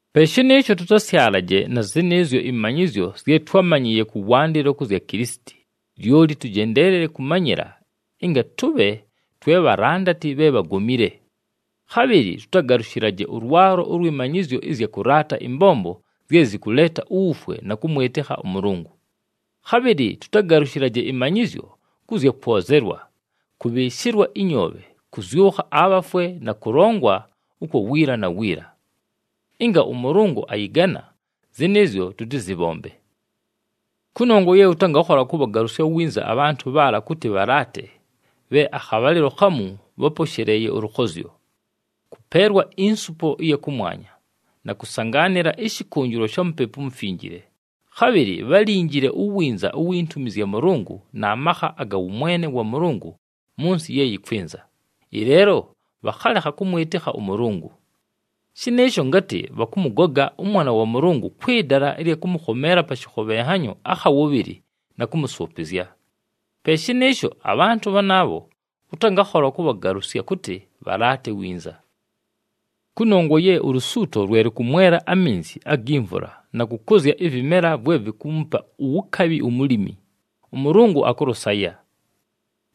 Pe shɨnɨɨsho tʉtasyalaje na zɨnɨɨzyo ɨmanyɨzyo zye twámanyɨɨye kʉwandɨlo kʉ zya Kilisiti, lyoli tʉjendeelele kʉmanyɨla, ɨnga tʉbhe twe bhalandati bhe bhagomile. Khabhɨlɨ tʉtagalʉshɨlaje ʉlwalo ʉlwɨ manyɨzyo ɨzya kʉlaata ɨmbombo zye zɨkʉleeta uwufwe na kʉmwɨtɨkha ʉMʉlʉngʉ. Khabhɨlɨ tʉtagalʉshɨlaje ɨmanyɨzyo kʉ zya kwozelwa, kʉbhɨɨshɨlwa ɨnyoobhe, kʉzyʉkha abhafwe na kʉlongwa ʉkwa wiila na wiila. Ɨnga ʉMʉlʉngʉ ayɨgana, zɨnɨɨzyo tʉtɨzɨbhombe. Kʉnongwa ye ʉtangakhola kʉbhagalʉsya winza abhantʉ bhaala kʉtɨ bhalaate bhe akhabhalɨlo khamu bháposheleeye ʉlʉkhozyo, kʉpeelwa insupo ɨya kʉmwanya, na kʉsangaanɨla ɨshɨkʉnjɨlwa sha Mupepu uMufinjile, khabhɨlɨ bhálinjile uwinza uwi ntumi zya Mʉlʉngʉ na makha aga wʉmwene wa Mʉlʉngʉ mʉ nsɨ ye yɨkwɨnza, ɨleelo bhakhalekha kʉmwɨtɨkha ʉMʉlʉngʉ. Shɨnɨɨsho ngatɨ bhakʉmʉgoga ʉMwana wa Mʉlʉngʉ kwɨ dala ɨlya kʉmʉkhomeela pa shɨkhobhenhanyo akha wʉbhɨlɨ na kʉmʉsʉʉpɨzya. Pe shɨnɨɨsho abhantʉ bhanaabho ʉtangakhola kʉbhagalʉsya kʉtɨ bhalaate winza. Kʉnongwa ye ulusuuto lwe lʉkʉmwela aminzi agi mvula na kʉkʉzya ɨvɨmela vwe vikuumupa uwukabhi umulimi, ʉMʉlʉngʉ akʉlʉsaya.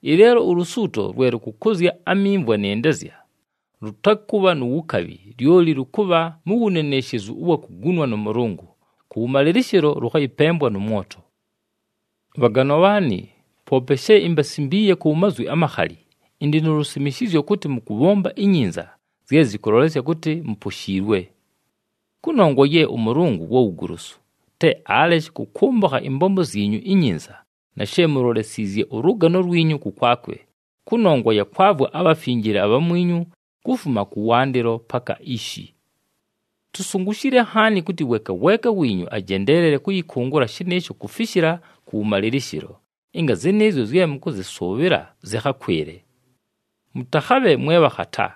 Ɨleelo ulusuuto lwe lʉkʉkʉzya amimvwa nɨ ndezya, lʉtakʉbha nu wukabhi, lyoli lʉkʉbha mu wuneneshezu ʉwa kugunwa nʉ Mʉlʉngʉ, kʉwʉmalɨlɨshɨlo lʉkhayɨpembwa nʉ mwoto. Bhaganwa bhaanɨ, poope she imbasimbiiye ku mazwi amakhali, ɨndɨ nu lusimishizyo kʉtɨ mʉkʉbhomba inyinza zye zɨkʉlolesya kʉtɨ muposhiilwe. Kʉnongwa ye ʉMʉlʉngʉ wa wugolosu, te aleshe kʉkʉmbʉkha ɨmbombo zyinyu inyinza na she mulolesiizye ʉlʉgano lwinyu kʉkwakwe, kʉnongwa ya kwavwa abhafinjile abhamwinyu kufuma kʉwandɨlo paka ishi. Tusungushile nhaani kʉtɨ weeka weeka wiinyu ajendeelele kʉyɨkʉngʉla shɨnɨɨsho kufishila kʉwʉmalɨlɨshɨlo, ɨnga zɨnɨɨzyo zye mʉkʉzɨsʉʉbhɨla zɨkhakwɨle. Mʉtakhabhe mwe bhakhata,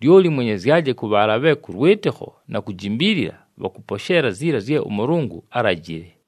lyoli mwenyezyaje kʉ bhaala bhe kʉ lwɨtɨkho na kujimbiilila bhakʉposheela ziila zye ʉMʉlʉngʉ álajile.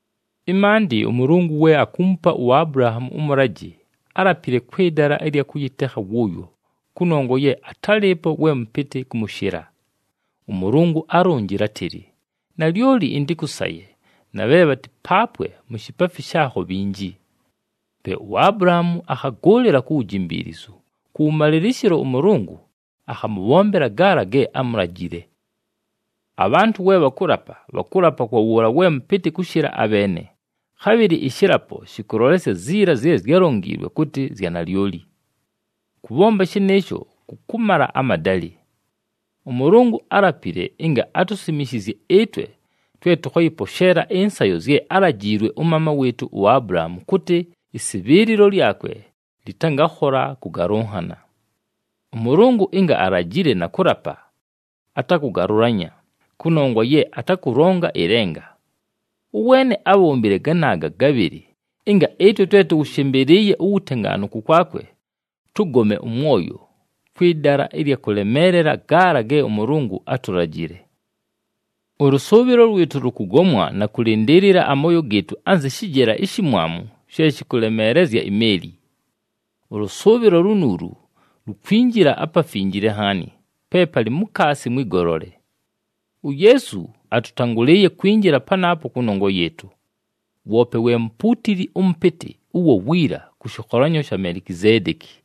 Ɨmaandɨ, ʉMʉlʉngʉ we akuumupa uAbulahaamu ʉmʉlajɨ, álapile kwɨ dala ɨlya kʉyɨtekha wʉʉyo, kʉnongwa ye atálɨɨpo we mʉpɨtɨ kʉmʉshɨla. ɄMʉlʉngʉ álonjile átɨlɨ, “Nalyoli ɨntɨkʉsaye na bhe bhatɨpaapwe mu shipaafi shaakho bhinji.” Pe uAbulahaamu akhagʉʉlɨla ku wujimbiilizu, kʉwʉmalɨlɨshɨlo ʉMʉlʉngʉ akhamʉbhombela gaala ge ámulajile. Abhantʉ we bhakʉlapa, bhakʉlapa kwa wʉʉla we mʉpɨtɨ kʉshɨla abheene, khabhɨlɨ ɨshɨlapo shɨkʉlolesya ziila zye zyálonjiilwe kʉtɨ zya nalyoli. Kʉbhomba shɨnɨɨsho kʉkʉmala amadalɨ. ɄMʉlʉngʉ álapile ɨnga atusimishizye ɨtwe twe tʉkhayɨposheela ɨnsayo zye álajiilwe ʉmaama wɨɨtʉ uAbulahaamu kʉtɨ ɨsɨbhɨɨlɨlo lyakwe lɨtangakhola kʉgalʉnhana. ɄMʉlʉngʉ ɨnga alajile na kʉlapa, atakʉgalʉlanya, kʉnongwa ye atakʉlonga ɨlenga. Ʉweene ábhombile ganaaga gabhɨlɨ ɨnga ɨtwe twe tʉwʉshɨmbɨlɨɨye uwutengaanu kʉkwakwe, tʉgome ʉmwoyo kwɨ dala ɨlya kʉlemeelela gaala ge ʉMʉlʉngʉ átulajile. Ʉlʉsʉʉbhɨlo lwɨtʉ lʉkʉgomwa na kʉlɨndɨɨlɨla amooyo gɨɨtʉ anzɨ shɨjela ishimwamu she shɨkʉlemeelezya imeeli. Ʉlʉsʉʉbhɨlo lunuulu lukwinjila aPafinjile Nhaani, pe palɨ mukaasi mwɨ golole. UYeesu atʉtangʉlɨɨye kwinjila panaapo kʉnongwa yɨɨtʉ. Woope we mupuutili ʉmʉpɨtɨ ʉwa wiila kʉ shɨkholanyo sha Melikizeedeki.